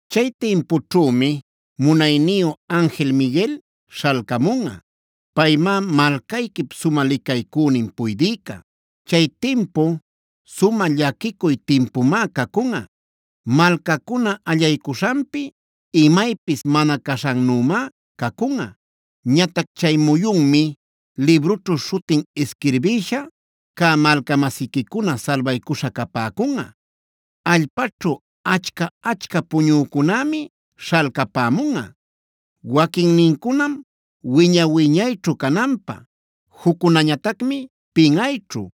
“Chay timpućhümi munayniyu anjil Miguel śhalcamunꞌa. Paymá malcayquip sumä licaycünin puydïca. Chay timpu sumä llaquicuy timpumá cacunꞌa.a Malcacuna allaycuśhanpi imaypis mana caśhannümá cacunꞌa. Ñatac chay muyunmi librućhu śhutin isquirbïsha cä malca-masiquicuna salbaycuśha capäcunꞌa. Allpaćhu achca-achca puñücunämi śhalcapämunꞌa. Waquinnincunam wiña-wiñayćhu cananpä, juccunañatacmi pinꞌayćhu,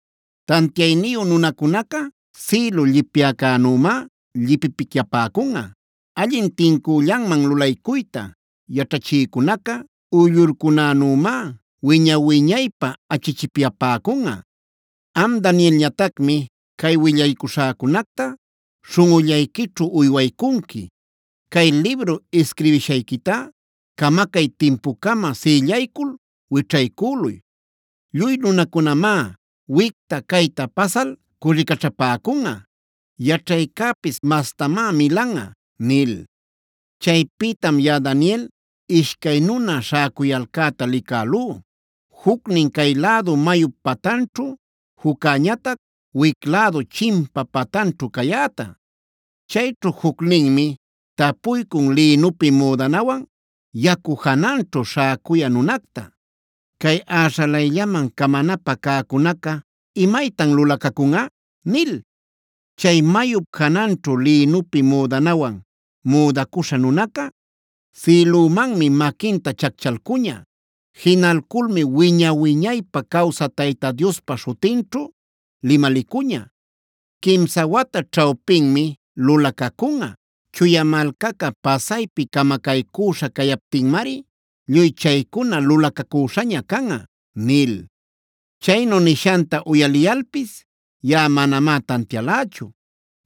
Tantiayniyu nunacunaca sïlu llipyäcänümá llipipicyapäcunꞌa. Allin tincüllanman lulaycuyta yaćhachïcunaca, uyllurcunänümá wiña-wiñaypä achichipyapäcunꞌa. “Am Danielñatacmi cay willaycuśhäcunacta śhunꞌullayquićhu uywaycunqui. Chay libru isquirbishayquitá camacay timpucama sïllaycul wićhaycüluy.c Lluy nunacunamá wicta-cayta pasal cürricaćhapäcunꞌa; yaćhaycäpis mastamá milanꞌa” nil. Chaypïtam yaꞌa Daniel ishcay nuna śhäcuyalcäta licälú; jucnin cay lädu mayup patanćhu, juccäñatac wic lädu chimpa patanćhu cayäta. Chayćhu jucninmi tapuycun lïnupi müdanawan yacu jananćhu śhäcuyä nunacta: “¿Cay äśhalayllaman camanapä cäcunaca, imaytan lulacacunꞌa?” nil. Chay mayup jananćhu lïnupi müdanawan müdacuśha nunaca, sïlümanmi maquinta chacchalcuña. Jinalculmi wiña-wiñaypä cawsä Tayta Diospa śhutinćhu limalicuña: “Quimsa wata ćhawpinmid lulacacunꞌa. Chuya malcaca pasaypi camacaycüśha cayaptinmari lluy chaycuna lulacacüśhaña canꞌa” nil. Chaynu nishanta uyaliyalpis yaꞌa manamá tantialächu.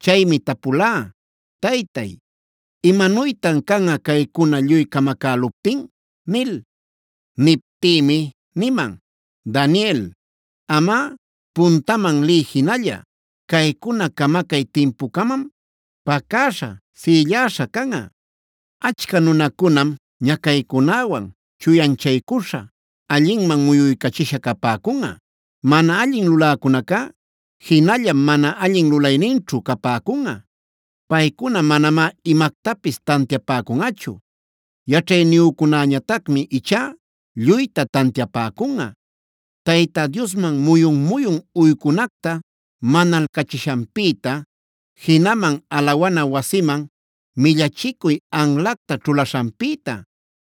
Chaymi tapulá: “Taytay, ¿imanuytan canꞌa caycuna lluy camacäluptin?” nil. Niptïmi niman: “Daniel, amꞌa puntaman liy jinalla. Caycuna camacay timpucamam pacäśha, sïlläśha canꞌa. Achca nunacunam ñacaycunäwan chuyanchaycuśha, allinman muyuycachisha capäcunꞌa. Mana allin luläcunacá jinallam mana allin lulayninćhu capäcunꞌa. Paycuna manamá imactapis tantiapäcunꞌachu. Yaćhayniyücunäñatacmi ichá lluyta tantiapäcunꞌa. “Tayta Diosman muyun-muyun uycunacta manalcachishanpïta, jinaman alawana wasiman millachicuy anlacta ćhulaśhanpïta,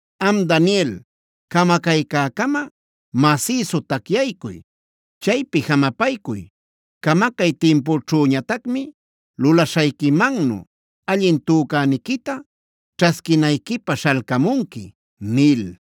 “Am Daniel, camacaycäcama masïsu tacyaycuy; chaypi jamapaycuy. Camacay timpućhüñatacmi lulaśhayquimannu allin tücäniquita ćhasquinayquipä śhalcamunqui” nil.